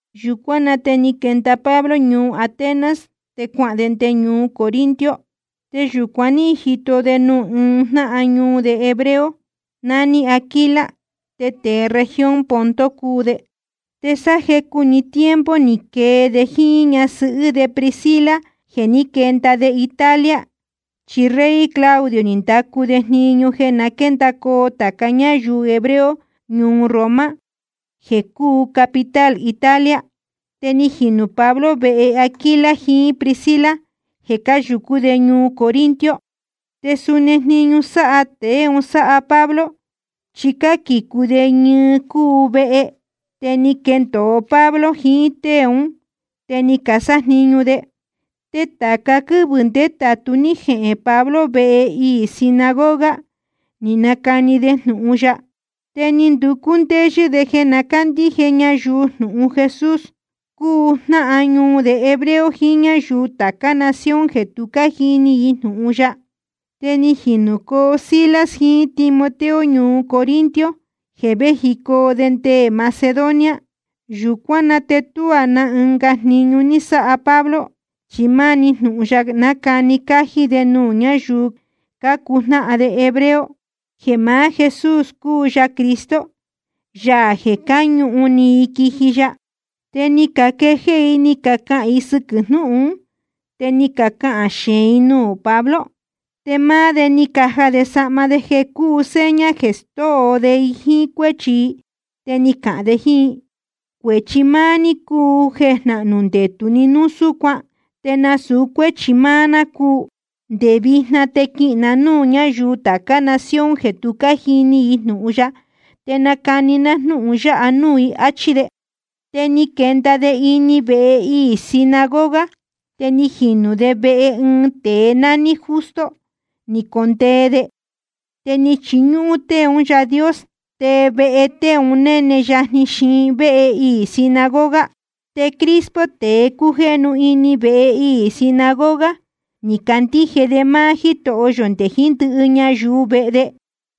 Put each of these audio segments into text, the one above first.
Yūcuán na te ni quenda Pablo ñuu Atenas, te cuahān de nde ñuu Corinto. Te yūcuan ní jito de nuū ɨɨn jnáhan ñuu de hebreo, nání Aquila, te tēe región Ponto cúu de. Te sáá jecu‑ni tiempo ni quee de jíín ñasɨhɨ́ de Priscila jeē ní quenda de Italia, chi rey Claudio ni ndacu de jniñu jeē na quéndacoo tāca ñáyuu hebreo ñuu Roma, jeē cúu capital Italia. Te ni jinū Pablo vehe Aquila jiín Priscila jeē cáyūcú de ñuu Corinto. Te suni jniñu sáha tēe un sáha Pablo, chi cáquīcu de ñɨɨ cuu vehe. Te ni quendōo Pablo jiín tée ún, te ni casájniñu de. Te tāca quɨ́vɨ̄ ndétātu ní jehēn Pablo vehe iī sinagoga ni nacani de jnūhun ya, te ni nducú ndéyɨ́ de jeē na cándíje ñayuu jnūhun Jesús, cúu jnáhan ñuu de hebreo jiín ñáyuu tācá nación jeē tu ní cájini i jnūhun ya. Te ni jinūcoo Silas jiín Timoteo ñuu Corinto jeē véjicoo de nde Macedonia. Yūcuán na te tuá na ɨnga jniñu ní sáha Pablo, chi máni jnūhun ya nácani cájí de nuū ñáyuu cácuu jnáhan de hebreo, jeē maá Jesús cúu ya Cristo, Yaā jeē cáñūhun ni i quiji ya. Te ni caquejéé i ni cacahān i sɨquɨ̄ jnúhun ún, te ni cacahān xeēn i nuū Pablo. Te máá de ni caja de sahma de jeē cúu seña jeē stóo de i jíín cuéchi i, te ni cahān de jíín i: Cuēchi máá ní cúu jeē jnahnū ndetū ni núu súcuan, te nasūu cuéchi máá ná cúu. Nde vijna te quihīn na núū ñáyuu tācá nación jeē tu cájini i jnūhun ya, te nacani ná jnúhun ya nuū i, áchí de. Te ni quenda de ini vehe iī sinagoga, te ni jinū de vehe ɨɨn tēe nání Justo ni condee de. Te chíñúhún tée un Yáā Dios, te vehe tēe un néne yajni xiin véhe iī sinagoga. Te Crispo, tēe cújéhnu ini vehe iī sinagoga, ni candíje de máá Jítoho yō nde jiín ndɨhɨ ñayuu vehe de.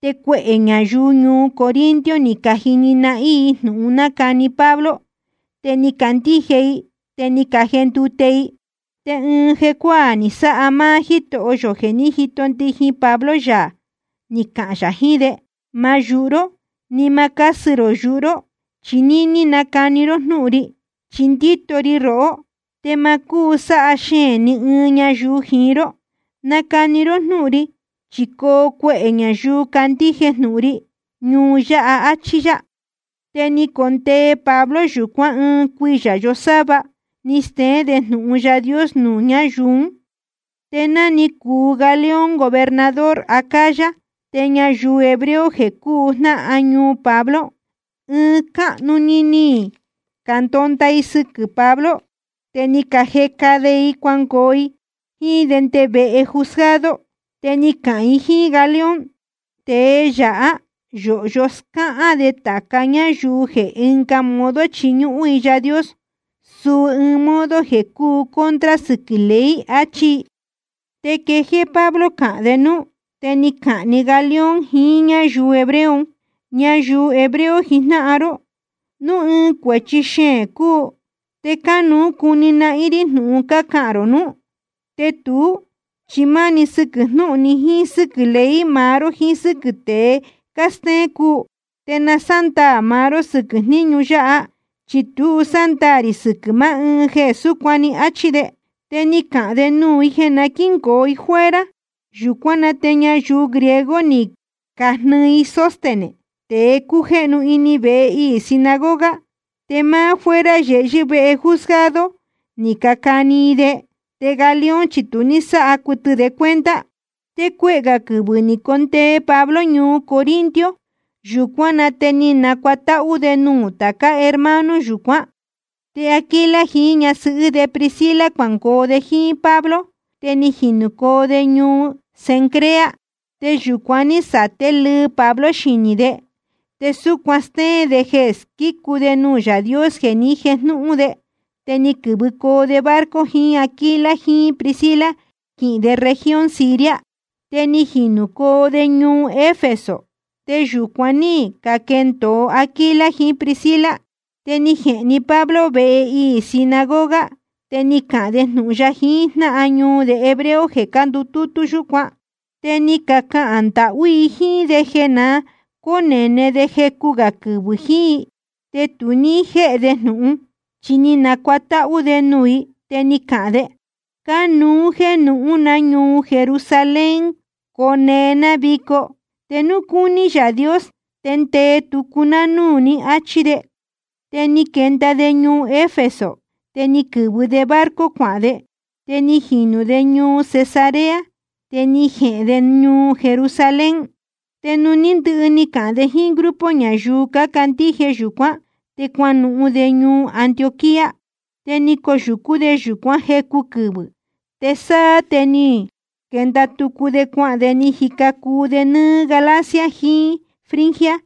Te cuehē ñayuu ñuu Corinto ni cajini nahín i jnūhun nácani Pablo, te ni cacandíje i, te ni cajendute i. Te ɨɨn jecuáā ni sáha máá Jítoho yō jeē ní jito ndijin Pablo yā ni cahān yā jiín de: Ma yūhu ró ni ma cásɨ rō yuhu ró, chi níní nacani ró jnúhun ri. Chi ndíto ri rohó, te ma cúu sáha xeēn ni ɨɨn ñayuu jiín ró. Nacani ró jnúhun ri, chi coo cuehē ñayuu candíje jnūhun ri ñuu yáha, áchí yá. Te ni condee Pablo yūcuán ɨɨn cuiyā yosáva ni steén de jnūhun Yaā Dios nuū ñáyuu ún. Te ná cúu Galión gobernador Acaya, te ñayuu hebreo jeē cúu jnáhan ñuu Pablo, ɨɨn cáhnu‑ni ni candonda i sɨquɨ̄ Pablo. Te ni cajeca i de cuangoo i jíín de nde vehe juzgado. Te ni cacahān i jíín Galión: Tēe yáha yōhyo scáhán de tāca ñáyuu jeē ɨnga modo chiñúhún i Yaā Dios, suu ɨɨn modo jeē cúu contra sɨquɨ̄ ley, achí i. Te quejéé Pablo cahān de núú, te ni cahān‑ni Galión jiín ñáyuu hebreo un: Ñayuu hebreo jijnáhan ró, núu ɨɨn cuēchi xeēn cúu, te cánuú cuni nahín rí jnūhun cácahān rō núú. Te tuú, chi máni sɨquɨ̄ jnúhun‑ni jíín sɨ́quɨ̄ ley maá ró jíín sɨ́quɨ̄ tée cástéén cúu. Te na sándaā maá ró sɨquɨ̄ jníñu yáha, chi tu sándaā rī sɨquɨ̄ maá ɨɨn jeē súcuan‑ni, áchí de. Te ni cahān de nuū i jeē na quíngoo i fuera. Yūcuán na te ñayuu griego ni cajnɨɨ i Sóstenes, tēe cújéhnu ini vehe iī sinagoga, te máá fuera yehyɨ́ vehe juzgado ni cacani i de, te Galión chi tu ní sáha cuɨtɨ de cuenta. Te cuehē gā quɨvɨ̄ ni condee Pablo ñuu Corinto. Yūcuán na te ni nacuatáhú de nuū tācá hermano yúcuan, te Aquila jiín ñasɨhɨ́ de Priscila cuangoo de jíín Pablo, te ni jinūcoo de ñuu Cencrea. Te yūcuan ní saté lɨɨ Pablo xinī de, te súcuan stéén de jeē squícu de nuū Yaā Dios jeē ni jéjnūhun de. Te ni quɨ̄vɨcoo de barco jiín Aquila jiín Priscila quihīn de región Siria. Te ni jinūcoo de ñuu Efeso, te yūcuan ní caquendōo Aquila jiín Priscila. Te ni jehēn‑ni Pablo vehe iī sinagoga, te ni cahān de jnūhun ya jiín jnáhan ñuu de hebreo jeē cándutútú yúcuan. Te ni cacahān ndahú i jíín de jeē na cónēne de jecu gā quɨvɨ̄ jiín i, te tu ní jéhe de jnūhun. Chi ni nacuatáhú de nuū i, te ni cahān de: Cánuú jéē nuhūn ná ñuu Jerusalén cone ná vico. Te núu cúní Yaā Dios te ndee tucu ná núū ní, áchí de. Te ni quenda de ñuu Efeso, te ni quɨ̄vɨ de barco cuahān de. Te ni jinū de ñuu Cesarea, te ni jehēn de ñuu Jerusalén. Te nuū ní ndɨhɨ ni cahān de jíín grupo ñayuu cácandíje yūcuán, te cuanuhun de ñuu Antioquía. Te ni coyūcú de yūcuán jecu quɨvɨ̄, te sáá te ni quenda tucu de cuahān de ni jica cuu de nɨ́ɨ́ Galacia jiín Frigia.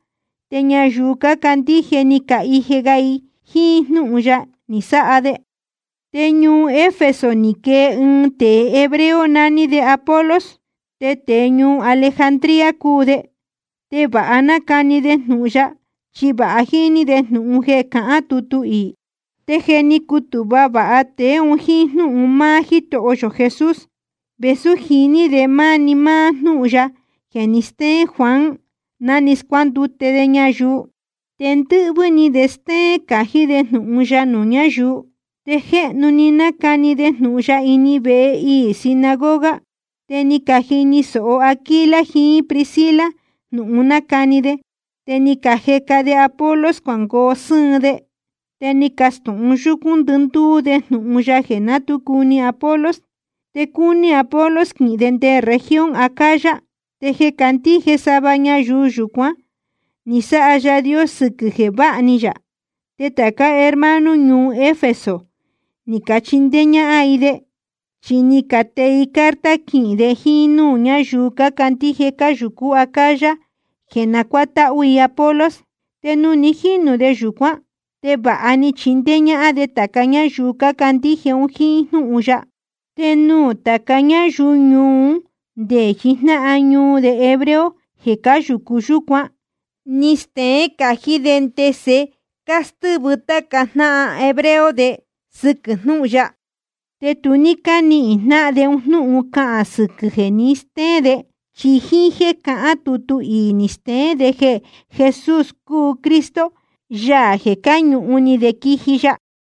Te ñayuu cácandíje ni cahije ga ni i jíín jnúhun ya ni sáha de. Te ñuu Efeso ni quee ɨɨn tēe hebreo nání Apolos, te tēe ñuu Alejandría cúu de. Te vāha nácani de jnūhun ya, chi vāha jíní de jnūhun jeē cahán tutu iī. Te je ni cutūhva vāha tēe un jíín jnúhun máá Jítoho yō Jesús, vēsú jiní de máni máá jnúhun ya jeē ni stéén Juan ná ni scuándute de ñayuu, te ndɨ́hvɨ́ ni de stéén cají de jnūhun ya nuū ñáyuu. Te jéhnu‑ni ni nacani de jnūhun ya ini vehe iī sinagoga. Te ni cajini sōho Aquila jiín Priscila jnūhun nácani de, te ni cajeca de Apolos cuangoo sɨ́ɨn de, te ni cacastūhun yúcún ndɨndúú de jnūhun ya jeē ná tu cuni Apolos. Te cúní Apolos quihīn de nde región Acaya. Te je cácandíje sava ñayuu yúcuan ní sáha Yaā Dios sɨquɨ̄ jeē váha ni yā. Te tācá hermano ñuu Efeso ni cachindéé ñáhán i de, chi ni catee i carta quihīn de jíín núū ñáyuu cácandíje cáyūcú Acaya jeē na cuátáhú i Apolos. Te nuū ni jínū de yūcuán, te vāha ni chindéé ñáhán de tāca ñáyuu cácandíje un jíín jnúhun ya. Te nuū tāca ñáyuu ñuu un ndé jiín jnáhan ñuu de hebreo jeē cáyūcu yúcuan, ní steén cají de ndese cástɨ́vɨ táca jnáhan hebreo de sɨquɨ̄ jnúhun ya. Te tu ní cánihīn jnáhan de un jnúhun cahān sɨquɨ̄ jeē ni stéén de, chi jíín jéē cahán tutu iī ni steén de jeē Jesús cúu Cristo, Yaā jeē cáñūhun ni de quiji ya.